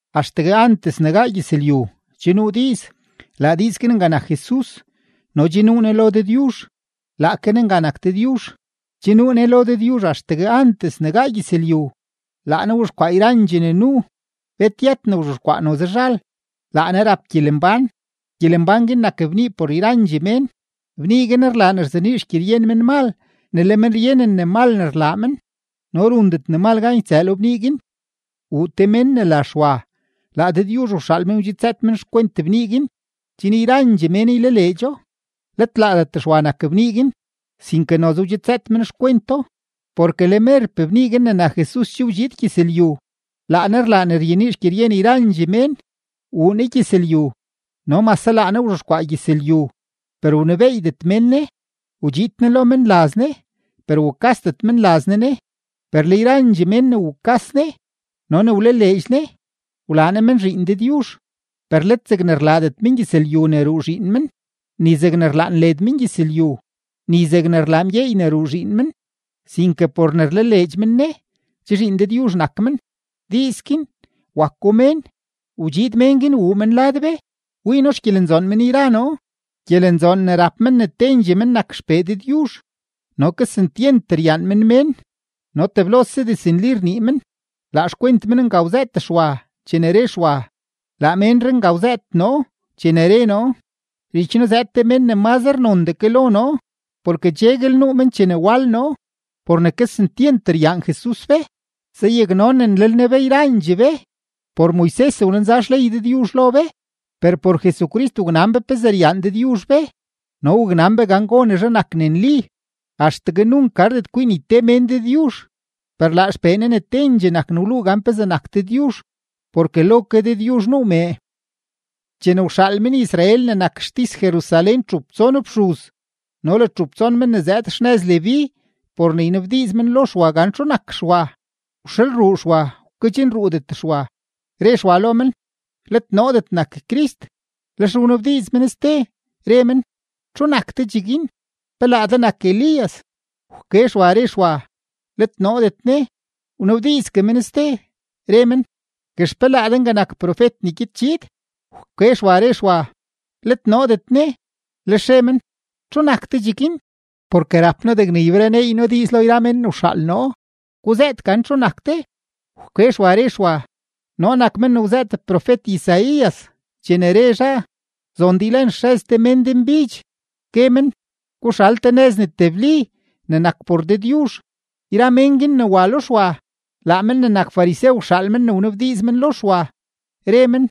Axtegue antes ne gaa gyëzlyu, che nuu diiz, laa diiz guin nga nak Jesus no che nuu Ne lo Dëdyuzh, laake Ne nga nak Dëdyuzh. Che nuu Ne lo Dëdyuzh axtegue antes ne gaa gyëzlyu. Laa Ne wzhexkwaa yrandxee ne nuu; bet yët ne wzhexkwaa noze zhal. Laa Ne rap gyelembán; gyelembán guin nak bnii por yrandxee mén. Bnii guin rlaa ne ryenii xgyeryen menmal ne le men ryenen ne mal ne rlaa men, no rundet ne mal gan ytsëë lo bnii guin. Wuu te mén ne la Xwa, laa Dëdyuzh wxaal men, wdxidzëët men xkwent bnii guin, chen yrandxee mén ylaleedxo. Let laadet Xwa nak bnii guin, sinke noze wdxidzëët men xkwento. Porke le merpee bnii guin ne nak Jesus che wdxiid gyëzlyu, laa Ne rlaa ne ryenii xgyeryen yrandxee mén. Wuu Ne gyëzlyu, no mase laa Ne wzhexkwaa gyëzlyu, per wnebeeydet mén Ne. Wdxiid Ne lo menlaz Ne, per wukasdet menlaz Ne Ne. Per le yrandxee mén ne wukas Ne no ne wlaleedx Ne, wlaa Ne men zhiin Dëdyuzh, per let zegne rlaadet mengyëzlyu ne ruu zhiin men, ni zegne rlaan led mengyëzlyu, ni zegne rlaa mgyeey ne ruu zhiin men, sinke por ne rlaleedx men Ne, che zhiin Dëdyuzh nak men. Diiz guin, wako mén, wdxiid mén guin wuu men lad be. Wii noo xgyelenzoon men yra noo, gyelenzoon ne rap men ne tendxee men nak XPee Dëdyuzh. No kesentyent ryaan men mén, no teblose diznli rnii men. Laa xkwent men nga wzëët Xwa chene re Xwa: ―Laa ménree nga wzëët noo chene re noo: “Zhich noo zëëd te mén ne mazre nondee ke lo noo, porke cheguel nuu men chene wal noo.” Por ne kesentyent ryaan Jesus be, zayaknonenlel Ne be yrandxee be. Por Moises wlenza xley Dëdyuzh lo be, per por Jesucrist waknan be pezee ryaan Dëdyuzh be no waknan be gan gonezhe nak ne nli. Axtegue nunk gardet kwii ni te mén Dëdyuzh, per laa XPee Ne ne tendxee nak ne wluu gan pezee nak Dëdyuzh, porke lo ke Dëdyuzh nuu mee. Chene wxaal men-Israel ne nak xtis-Jerusalén txup tson fxuz no le txup tson men ne zëëd xnëz Leví por ne ynabdiiz men lo Xwa gan txu nak Xwa, wxalruu Xwa, wkedxnruudet Xwa, re Xwa lo men: ―Let noodet nak Crist. Lex wnabdiiz men ste, re men: ―¿Txu nak de cheguin? ¿Pe laa de nak Elías? Wke Xwa, re Xwa: ―Let noodet ne. Wnabdiizgue men ste, re men: ―Guex, ¿pe laa de nga nak profet ne gyed chiid? Wke Xwa, re Xwa: ―Let noodet ne. Lex re men: ―¿Txu nak de cheguin? Porke rap noo degne ybereneey noo diiz lo yra mén ne wxaal noo. Guzëët gan txu nak de. Wke Xwa, re Xwa: ―Noo nak men ne wzëët profet-Isaías chene re zhaa: “Zon de ylen xrëz te mén denbidx, gue men: Guxal te nëz ne tebli ne nak por Dëdyuzh.” Yra mén guin ne wa lo Xwa, laa men ne nak farisew wxaal men ne wanabdiiz men lo Xwa, re men: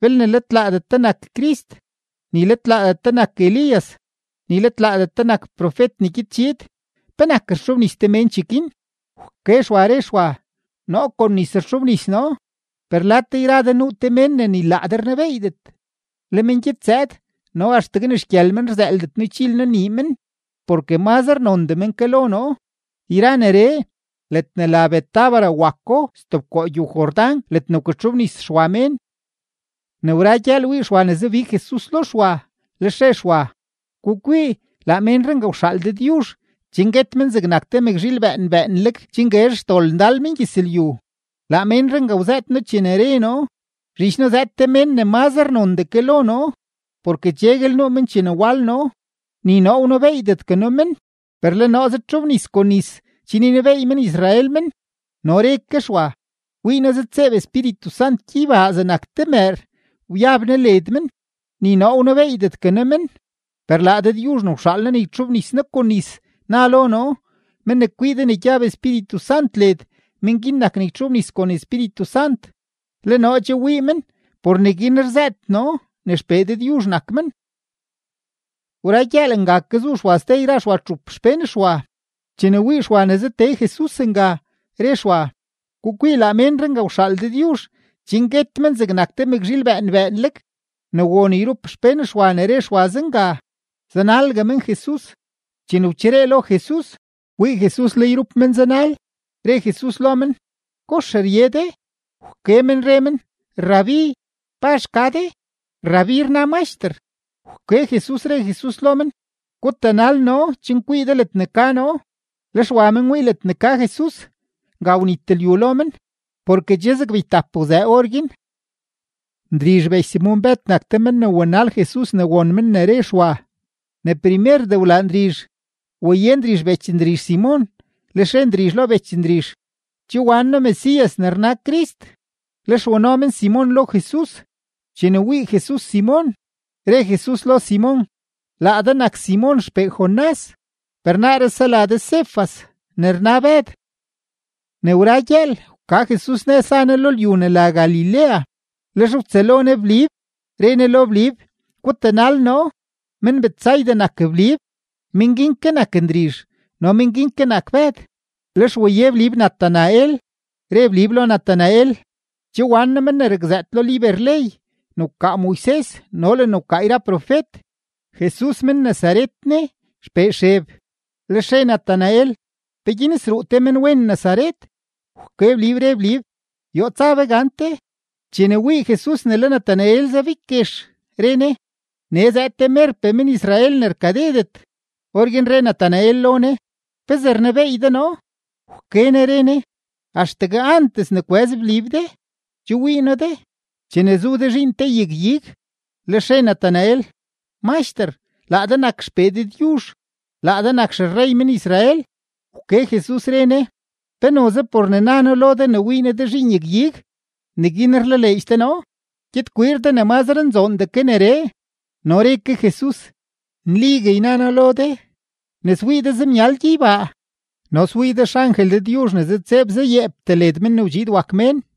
―Belne let laadet de nak Crist, ni let laadet de nak Elías, ni let laadet de nak profet ne gyed chiid, ¿penak rtxobnis de mén cheguin? Wke Xwa, re Xwa: ―Noo kon nis rtxobnis noo, per lad de yra de nuu te mén ne ni laa de rnebeeydet. Le men gyed zëëd no axtegue ni xgyël men rzëëldet noo ychil noo nii men porke mazre nondee men ke lo noo. Yra neree, ledne la Betábara wako stebkoo gyow-Jordán ledne wkatxobnis Xwa mén. Ne wra gyëël wii Xwa ne zabig Jesus lo Xwa, lex re Xwa: ―Gukwii, laa ménree nga wxaal Dëdyuzh chen guet men zegnak te mëkzhiil bëën bëënleg chen guezh xdol mengyëzlyu. Laa menree nga wzëët noo chene re noo: “Zhich noo zëëd te mén ne mazre nondee ke lo noo, porke cheguel nuu men chene wal noo.” Ni noo wnebeeydetgue noo men, per le noo zëdtxobnis kon nis chen ynebeey men-Israel men. No re ke Xwa: ―Wii noo zëdtseeb Espíritu Sant gyeybaa zegnak te mëër, wyab Ne led men. Ni noo wnebeeydetgue noo men; per laa Dëdyuzh ne wxaal noo ne ytxobnis noo kon nis, na lo noo: “Men ne kwii de ne gyab Espíritu Sant led, men guin nak ne ytxobnis kon Espíritu Sant.” Le noo che wii men, por neguin rzëët noo ne XPee Dëdyuzh nak men. Wra gyëël, nga ke zu Xwa ste yra Xwa txup xpén Xwa. Chene wii Xwa ne zatee Jesus nga, re Xwa: ―Gukwii, laa menree nga wxaal Dëdyuzh chen guet men zegnak te mëkzhiil bëën bëënleg. Ne won yrup xpén Xwa ne re Xwa zenga, zanalgue men Jesus. Chene wcheree lo Jesus, wii Jesus le yrup men zanal, re Jesus lo men: ―¿Kox rye de? Wke men re men: ―Rabí, ¿pazh ka de? (Rabí rna Maxter). Wke Jesus, re Jesus lo men: ―Gutanal noo chen kwii de ledne ka noo. Lex wa men wii ledne ka Jesus, nga wnit lyu lo men, porke che zeg beytap wzëë orguin. Ndrizh bech Simon-Bëd nak te men ne wanal Jesus ne won men ne re Xwa. Ne primerdee wlaa Ndrizh, waye Ndrizh bech Ndrizh Simon, lex re Ndrizh lo bech Ndrizh: ―Che wan noo Mesías (ne rna Crist). Lex wano men Simon lo Jesus; chene wii Jesus Simon, re Jesus lo Simon: ―Laa de nak Simon xpee Jonás, per naaree sela de Cefas (ne rna Bëd). Ne wra gyëël, wka Jesus nëz za Ne lo lyu ne la Galilea, lex wtsëlo Ne Blib, re Ne lo Blib: ―Gutanal noo. Men-Betsaida nak Blib, men guin ke nak Ndrizh no men guin ke nak Bëd. Lex waye Blib Natanael, re Blib lo Natanael: ―Che wan noo men ne rakzëët lo liber-ley ne wkaa Moises no le ne wkaa yra profet. Jesus men-Nazaret ne, xpee Xeb. Lex re Natanael: ―¿Peguin sruu te menwen Nazaret? Wke Blib, re Blib: ―Yoo tsa be gante. Chene wii Jesus ne le Natanael zabig guex, re Ne: ―Nee zëëd te merpee men-Israel ne rkadedet. Orguin re Natanael lo Ne: ―¿Pezee rnebeey de noo? Wke Ne re Ne: ―Axtegue antes ne kwëz Blib de, che wii noo de, chene zu de zhiin te yag-ig. Lex re Natanael: ―Maxter, laa de nak XPee Dëdyuzh, laa de nak xerrey men-Israel. Wke Jesus, re Ne: ―¿Pe noze por ne na noo lo de ne wii noo de zhiin yag-ig, neguin rlaleedx de noo? Gyed kwiir de ne mazre nzoondee ke neree. No re ke Jesus: ―Nligue yna noo lo de, ne swii de zemyal gyeybaa no swii de xangel Dëdyuzh ne zëdtseeb zayeeptee led Men ne wdxiid wak Mén.